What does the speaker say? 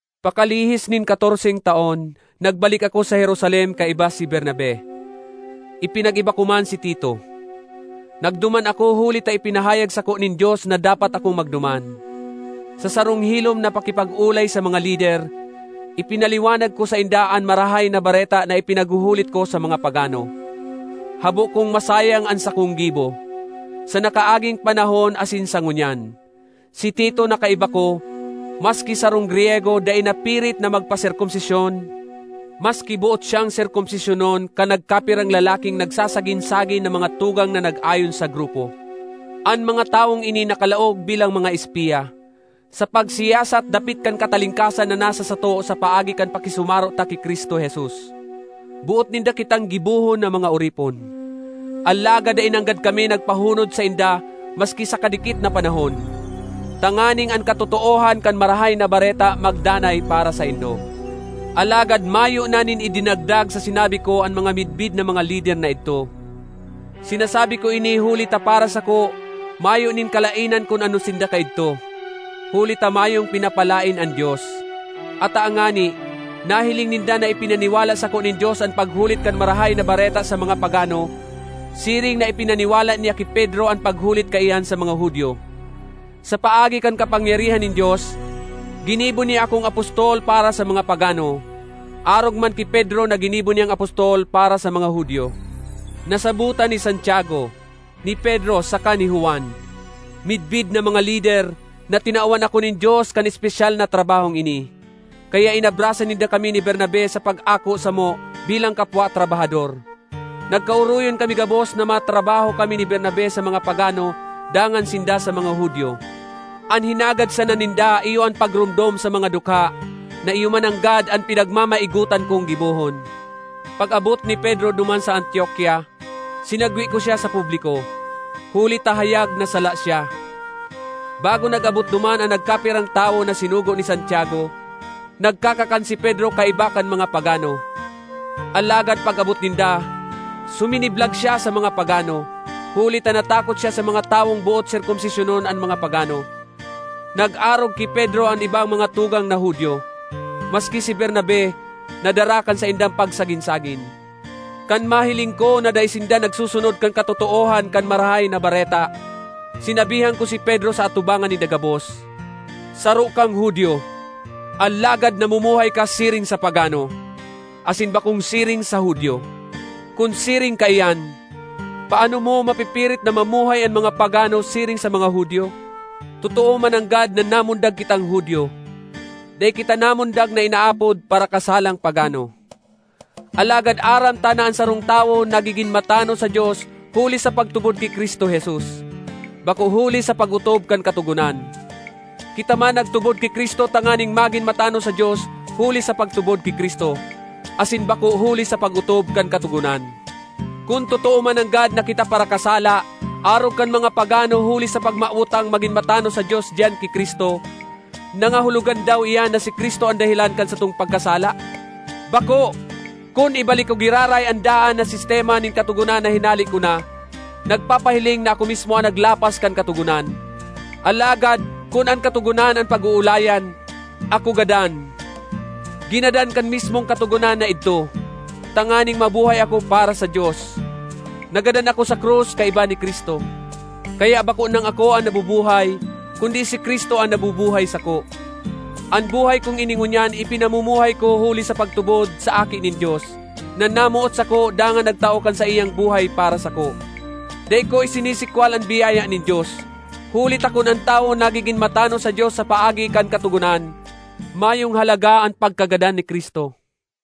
Pakalihis nin katorseng taon nagbalik ako sa Jerusalem kaiba si Bernabe; ipinag-iba ko man si Tito. Nagduman ako huli ta ipinahayag sako nin Dios na dapat akong magduman. Sa sarong hilom na pakipag-olay sa mga lider, ipinaliwanag ko sainda an Marahay na Bareta na ipinaghuhulit ko sa mga pagano. Habo kong masayang an sakong gibo sa nakaaging panahon asin sa ngunyan. Si Tito na kaiba ko, maski sarong Griyego, dai napirit na magpaserkomsisyon, maski boot siyang serkomsisyonon kan nagkapirang lalaking nagsagin-sagin na mga tugang na nag-ayon sa grupo. An mga tawong ini nakalaog bilang mga espiya, sa pagsiyasat dapit kan katalingkasan na nasa sato sa paagi kan pakisumaro ta ki Cristo Jesus. Boot ninda kitang gibohon na mga oripon. Alagad dai nanggad kami nagpahunod sainda maski sa kadikit na panahon, tanganing an katotoohan kan Marahay na Bareta magdanay para saindo. Alagad mayo na nin idinagdag sa sinabi ko an mga midbid na mga lider na idto. (Sinasabi ko ini huli ta para sako mayo nin kalaenan kun ano sinda kaidto, huli ta mayong pinapalaen an Dios.) Ata ngani, nahiling ninda na ipinaniwala sako nin Dios an paghulit kan Marahay na Bareta sa mga pagano, siring na ipinaniwala niya ki Pedro an paghulit kaiyan sa mga Judio. Sa paagi kan kapangyarihan nin Dios, ginibo niya akong apostol para sa mga pagano, arog man ki Pedro na ginibo niyang apostol para sa mga Judio. Nasabotan ni Santiago, ni Pedro saka ni Juan, midbid na mga lider, na tinawan ako nin Dios kan espesyal na trabahong ini. Kaya inabrasa ninda kami ni Bernabe sa pag-ako samo bilang kapwa trabahador. Nagkaoroyon kami gabos na matrabaho kami ni Bernabe sa mga pagano dangan sinda sa mga Judio. An hinagad sana ninda iyo an pagromdom sa mga dukha, na iyo mananggad an pinagmamaigotan kong gibohon. Pag-abot ni Pedro duman sa Antiokia, sinagwe ko siya sa publiko, huli ta hayag na sala siya. Bago nag-abot duman an nagkapirang tawo na sinugo ni Santiago, nagkakakan si Pedro kaiba kan mga pagano, alagad pag-abot ninda, suminiblag siya sa mga pagano, huli ta natakot siya sa mga tawong boot serkomsisyonon an mga pagano. Nag-arog ki Pedro an ibang mga tugang na Judio; maski si Bernabe nadara kan saindang pagsagin-sagin. Kan mahiling ko na dai sinda nagsusunod kan katotoohan kan Marahay na Bareta, sinabihan ko si Pedro sa atubangan ninda gabos, “Saro kang Judio, alagad namumuhay ka siring sa pagano, asin bakong siring sa Judio. Kun siring kaiyan, paano mo mapipirit na mamuhay an mga pagano siring sa mga Judio?” Totoo mananggad na namundag kitang Judio; dai kita namundag na inaapod “parakasalang pagano.” Alagad aram ta na an sarong tawo nagigin matanos sa Dios huli sa pagtubod ki Cristo Jesus, bako huli sa pag-otob kan Katogonan. Kita man nagtubod ki Cristo tanganing magin matanos sa Dios huli sa pagtubod ki Cristo, asin bako huli sa pag-otob kan Katogonan. Kun totoo mananggad na kita parakasala arog kan mga pagano huli sa pagmawot tang magin matanos sa Dios diyan ki Cristo, nangahulogan daw iyan na si Cristo an dahelan kan satong pagkasala? Bako! Kun ibalik ko giraray an daan na sistema nin Katogonan na hinale ko na, nagpapahiling na ako mismo an naglapas kan Katogonan. Alagad kun an Katogonan an pag-oolayan, ako gadan—ginadan kan mismong Katogonan na idto—tanganing mabuhay ako para sa Dios. Nagadan ako sa krus kaiba ni Cristo, kaya bako nang ako an nabubuhay, kundi si Cristo an nabubuhay sako. An buhay kong ini ngunyan ipinamumuhay ko huli sa pagtubod sa Aki nin Dios, na namoot sako dangan nagtao kan saiyang buhay para sako. Dai ko isinisikwal an biyaya nin Dios. Huli ta kun an tawo nagigin matanos sa Dios sa paagi kan Katogonan, mayong halaga an pagkagadan ni Cristo.